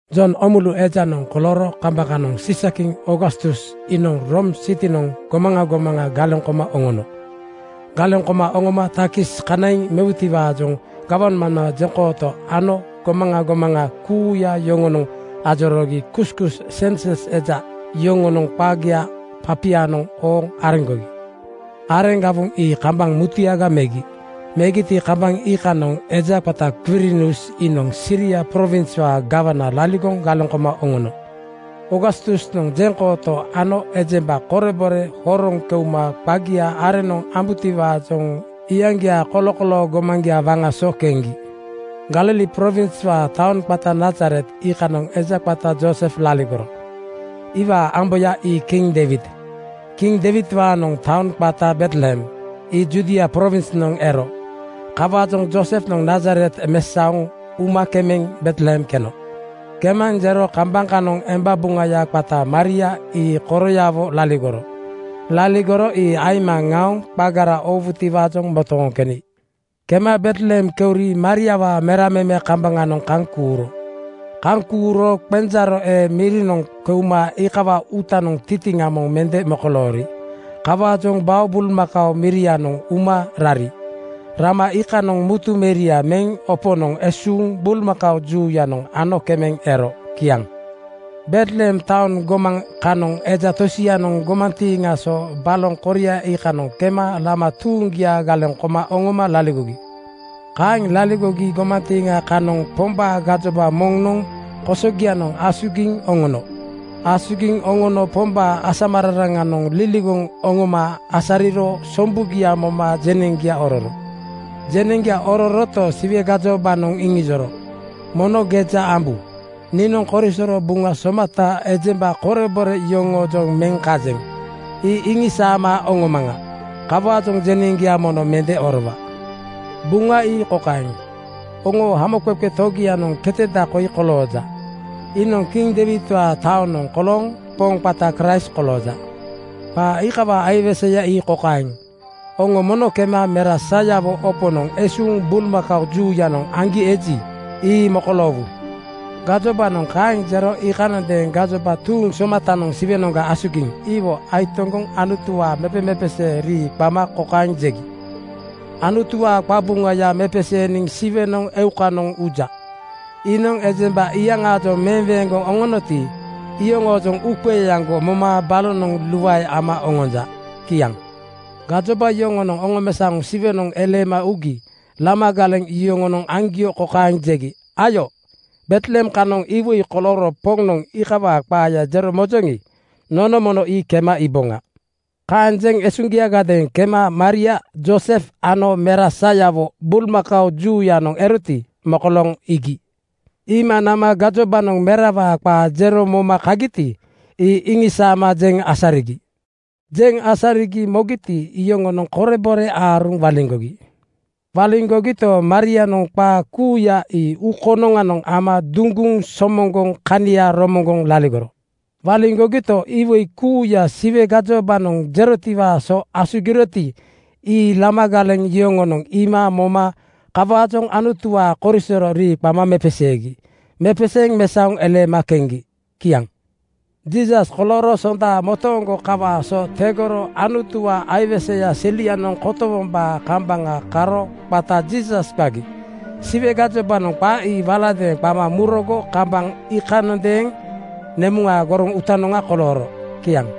Jon Oomulu ejanoŋ kolooro kambaŋ kanoŋ Siisa-kiŋ Oogastus iinoŋ Room sitinoŋ gomaŋa gomaŋa galeŋ koma oŋono. Galeŋ koma oŋoma takis kanaiŋ mewutiwaajoŋ gawmambaa jeŋkooto ano gomaŋa gomaŋa kuuya yoŋonoŋ ajoroogi kuskus (sensus eja) yoŋonoŋ qagia papianoŋ ooŋ areŋgogi. Areŋ gawoŋ ii kambaŋ mutuyaga megi. Megiti, kambaŋ iikanoŋ eja qata Kwirinius iinoŋ Siria prowinswaa gawana laligoŋ galeŋ koma oŋono. Oogastusnoŋ jeŋkooto ano ejemba korebore horoŋ keuma qagia areŋnoŋ oowutiwaajoŋ iyaŋgiaa kolokoloo gomaŋgia waŋa so keŋgi. Galili prowinswaa taoŋ qata Nazaret iikanoŋ eja qata Joosef laligoro. Iwaa amboya ii kiŋ Deiwid. Kiŋ Deiwidwaanoŋ taoŋ qata Betlehem ii Judia prowinsnoŋ ero. Kawaajoŋ Joosefnoŋ Nazaret mesaoŋ uma kemeŋ Betlehem keno. Kemaŋ jero kambaŋ kanoŋ emba buŋaya qata Maria ii koroyawo laligoro. Laligoro ii aima ŋaoŋ qagara oowutiwaajoŋ motooŋ keni. Kema Betlehem keuri Mariawaa mera meme kambaŋanoŋ kaŋ kuuro. Kaŋ kuuro qenjaaro ee mirinoŋ keuma iikawaa uutanoŋ tintiŋa moŋ mende mokoloori. Kawaajoŋ bao bulmakao mirianoŋ uma rari. Rama iikanoŋ mutu meria meŋ oponoŋ esuuŋ bulmakao juuyanoŋ ano kemeŋ ero. Kiaŋ. Betlehem taoŋ gomaŋ kanoŋ eja tosianoŋ gomantiiŋa so baloŋ koria iikanoŋ kema lama tuuŋgia galeŋ koma oŋoma laligogi. Kaeŋ laligogi gomantiiŋa kanoŋ Pombaa gajoba moŋnoŋ kosogianoŋ asugiŋ oŋono. Asugiŋ oŋono Pombaa asamararaŋanoŋ liligoŋ oŋoma asariro sombugia moma jeneŋgia ororo. Jeneŋgia ororoto, Siwe gajobanoŋ iŋijoro, “Mono geja ambu! Niinoŋ korisoro Buŋa somata ejemba korebore yoŋoojoŋ meŋ kajeŋ, ii iŋisaama oŋomaŋa. Kawaajoŋ jeneŋgia mono mende orowa. Buŋa ii kokaeŋ: Oŋoo Hamoqeqe Togianoŋ keteda koi kolooja. Iinoŋ kiŋ Deiwidwaa taonoŋ kolooŋ Poŋ qata Kraist kolooja. Qaa iikawaa aiweseya ii kokaeŋ: Oŋo mono kema mera sayawo oponoŋ esuuŋ bulmakao juuyanoŋ aŋgi eji, ii mokoloowu.” Gajobanoŋ kaeŋ jero iikanondeeŋ gajoba tuuŋ somatanoŋ Siwenoŋga asugiŋ iwo aitoŋgoŋ Anutuwaa mepemepesee rii qama kokaeŋ jegi, “Anutuwaa qabuŋaya mepeseeniŋ Siwenoŋ eukanoŋ uja. Iinoŋ ejemba iyaŋaajoŋ meweeŋgoŋ oŋonoti, iyoŋoojoŋ uuqeeaŋgo moma balonoŋ luae ama oŋonja.” Kiaŋ. Gajoba yoŋonoŋ oŋomesaoŋ Siwenoŋ eleema ugi lama galeŋ yoŋonoŋ aŋgio kokaeŋ jegi, “Ayo, Betlehem kanoŋ iwoi kolooro Poŋnoŋ iikawaa qaaya jero mojoŋi, nono mono ii kema iiboŋa.” Kaeŋ jeŋ esuŋgiagadeeŋ kema Maria Joosef ano mera sayawo bulmakao juuyanoŋ eroti, mokolooŋ iigi. Iima nama gajobanoŋ merawaa qaa jero moma kagiti, ii iŋisaama jeŋ asarigi. Jeŋ asarigi mogiti, iyoŋonoŋ korebore aaruŋ waliŋgogi. Waliŋgogito, Marianoŋ qaa kuuya ii uu konoŋanoŋ ama duŋguŋ somoŋgoŋ kania romoŋgoŋ laligoro. Waliŋgogito, iwoi kuuya Siwe gajobanoŋ jerotiwaa so asugiroti, ii lama galeŋ yoŋonoŋ iima moma kawaajoŋ Anutuwaa korisoro rii qama mepeseegi. Mepeseeŋ mesaoŋ eleema keŋgi. Kiaŋ. Jiisas kolooro Sonda motooŋgo kawaa so tegoro Anutuwaa aiweseya selianoŋ kotowombaa kambaŋa karo qata Jiisas qagi. Siwe gajobanoŋ qa ii waladeeŋ qama murogo kambaŋ iikanondeeŋ nemuŋaa goroŋ uutanoŋa kolooro. Kiaŋ.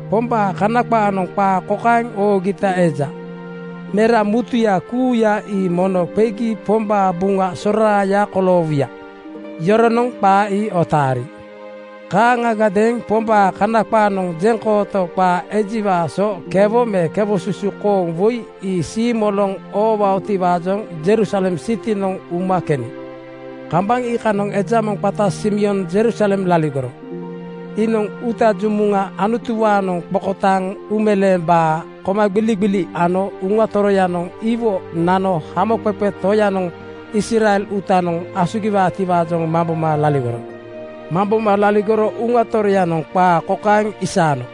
Pombaa Kana qaanoŋ qaa kokaeŋ oogita eja, “Mera mutuya kuuya ii mono qegi Pombaa buŋa soraaya koloowuya.” Yoronoŋ qaa ii otaari. Kaaŋagadeeŋ Pombaa Kana qaanoŋ jeŋkooto qaa ejiwaa so kewo me kewosusu kooŋ woi ii siimoloŋ oowaotiwaajoŋ Jerusalem sitinoŋ uma keni. Kambaŋ iikanoŋ eja moŋ qata Simeon Jerusalem laligoro. Iinoŋ uuta jumuŋa Anutuwaanoŋ qokotaaŋ uumeleembaa komagbiligbili ano Uŋa Toroyanoŋ iwo nano Hamoqeqe Toyanoŋ Israel uutanoŋ asugiwaatiwaajoŋ mamboma laligoro. Mamboma laligoro Uŋa Toroyanoŋ qaa kokaeŋ isaano,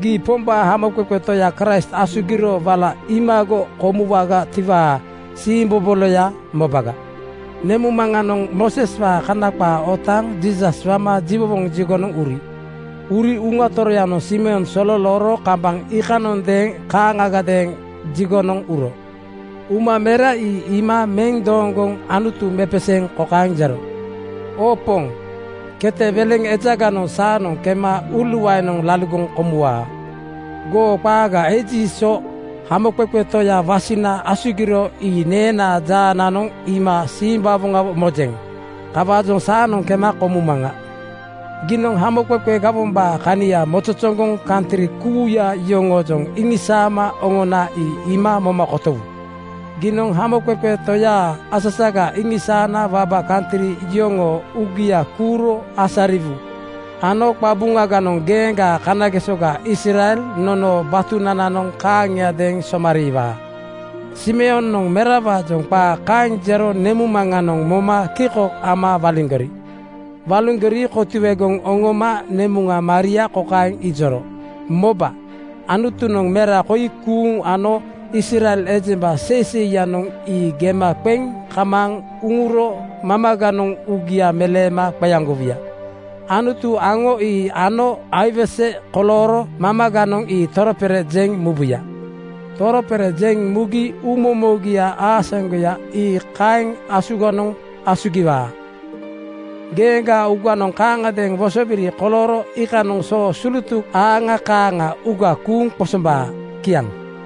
“Gii Pombaa Hamoqeqe Toya Kraist asugiro wala iimago koomuwagatiwaa siimboboloya mobaga.” Nemuŋmaŋanoŋ Mooseswaa Kana qaa otaaŋ Jiisas wama jiwowoŋ jigonoŋ uri. Uri Uŋa Toroyanoŋ Simeon sololooro kambaŋ iikanondeeŋ kaaŋagadeeŋ jigonoŋ uro. Uma mera ii iima meŋ dooŋgoŋ Anutu mepeseeŋ kokaeŋ jero, “Oo Poŋ, kete weleŋ ejaganoŋ saanoŋ kema uuluaenoŋ laligoŋ komuwaa. Goo qaaga eji so Hamoqeqe Toya wasina asugiro ii neenaa jaananoŋ iima simbawoŋawo mojeŋ. Kawaajoŋ saanoŋ kema komumaŋa. Giinoŋ hamoqeqe gawombaa kania mozozoŋgoŋ kantri kuuya yoŋoojoŋ iŋisaama oŋona ii iima moma kotowu. Giinoŋ Hamoqeqe Toyaa asasaga iŋisaana waba kantri yoŋoo uugia kuuro asariwu ano qabuŋaganoŋ geeŋgaa kanagesoga Israel nonoo batunananoŋ kaaŋiadeeŋ somariiwaa.” Simeonoŋ merawaajoŋ qaa kaeŋ jero nemuŋmaŋanoŋ moma kiko ama waliŋgori. Waliŋgori kotuegoŋ oŋoma nemuŋa Maria kokaeŋ ijoro, “Moba, Anutunoŋ mera koi kuuŋ ano Israel ejemba seiseiyanoŋ ii gema qeŋ kamaaŋ uŋuro mamaganoŋ uugia meleema qeaŋgowuya. Anutu aŋo ii ano aiwese kolooro mamaganoŋ ii toropere jeŋ mubuya. Toropere jeŋ mugi uumomogia aasaŋgoya ii kaeŋ asuganoŋ asugiwaa. Geeŋgaa uuganoŋ kaaŋagadeeŋ wosobiri kolooro iikanoŋ soo sulutuk aaŋa kaaŋa uuga kuuŋ qosombaa.” Kiaŋ.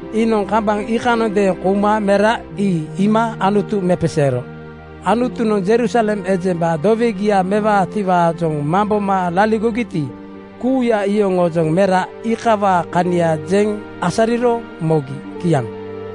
Iinoŋ kambaŋ iikanondeeŋ kouma mera ii iima Anutu mepeseero. Anutunoŋ Jerusalem ejemba dowegia mewaatiwaajoŋ mamboma laligogiti, kuuya iyoŋoojoŋ mera iikawaa kania jeŋ asariro mogi. Kiaŋ.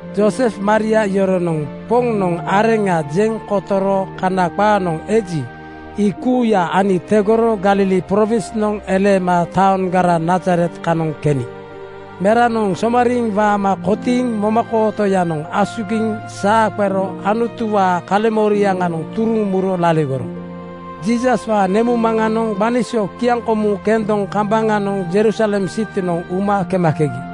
Joosef Maria yoronoŋ Poŋnoŋ areŋa jeŋ kotoro Kana qaanoŋ eji, ii kuuya ani tegoro Galili prowinsnoŋ eleema taoŋgara Nazaret kanoŋ keni. Meranoŋ somariiŋ waama kotiiŋ momakootoyanoŋ asugiŋ saa qero Anutuwaa kaleŋmoriaŋanoŋ turuŋ muro laligoro. Jiisaswaa nemuŋmaŋanoŋ gbani so kiaŋkomu kendoŋ kambaŋanoŋ Jerusalem sitinoŋ uma kemakegi.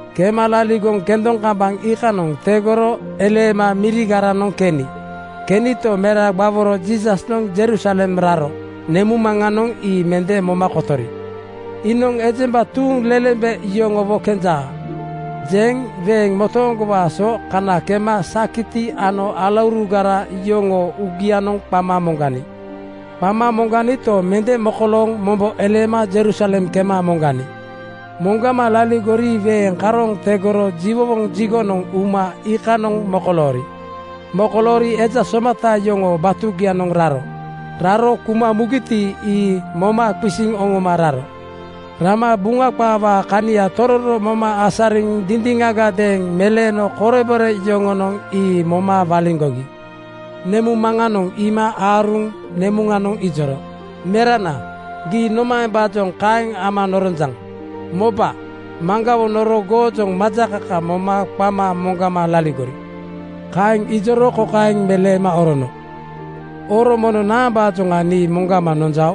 Kema laligoŋ kendoŋ kambaŋ iikanoŋ tegoro eleema mirigaranoŋ keni. Kenito, mera gbaworo Jiisasnoŋ Jerusalem raro nemuŋmaŋanoŋ ii mende moma kotori. “Iinoŋ ejemba tuuŋlelembe yoŋowo kenja,” jeŋ weeŋ motooŋgowaa so kana kema sakiti ano alaurugara yoŋoo uugianoŋ qama moŋgani. Qama moŋganito, mende mokolooŋ mombo eleema Jerusalem kema moŋgani. Moŋgama laligori weeŋ karooŋ tegoro jiwowoŋ jigonoŋ uma iikanoŋ mokoloori. Mokoloori eja somata yoŋoo batugianoŋ raro. Raro kuma mugiti, ii moma qisiŋ oŋoma raro. Rama Buŋa qaawaa kania tororo moma asariŋ dindiŋagadeeŋ meleeno korebore yoŋonoŋ ii moma waliŋgogi. Nemuŋmaŋanoŋ iima aaruŋ nemuŋanoŋ ijoro, “Merana, gii nomaembaajoŋ kaeŋ ama noronjaŋ? Moba, maŋgawo noro goojoŋ majakaka moma qama moŋgama laligori.” Kaeŋ ijoro kokaeŋ meleema orono, “Oro mono naambaajoŋ nii moŋgama nonjao?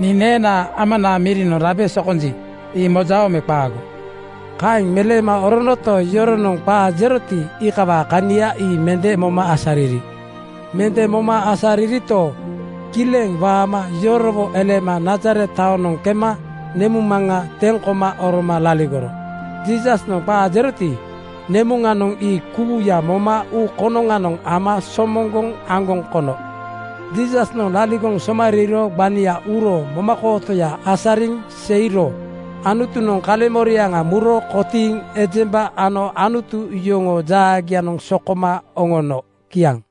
Nii neenaa Amanaa mirinoŋ rabe sokonji, ii mojao me qaago?” Kaeŋ meleema oronoto, yoronoŋ qaa jeroti, iikawaa kania ii mende moma asariri. Mende moma asaririto, kileŋ waama yorowo eleema Nazaret taonoŋ kema nemuŋmaŋa teŋ koma oroma laligoro. Jiisasnoŋ qaa jeroti, nemuŋanoŋ ii kuuya moma uu konoŋanoŋ ama somoŋgoŋ aŋgoŋ kono. Jiisasnoŋ laligoŋ somariiro gbania uro momakootoya asariŋ seiro Anutunoŋ kaleŋmoriaŋa muro kotiiŋ ejemba ano Anutu yoŋoo jaagianoŋ sokoma oŋono. Kiaŋ.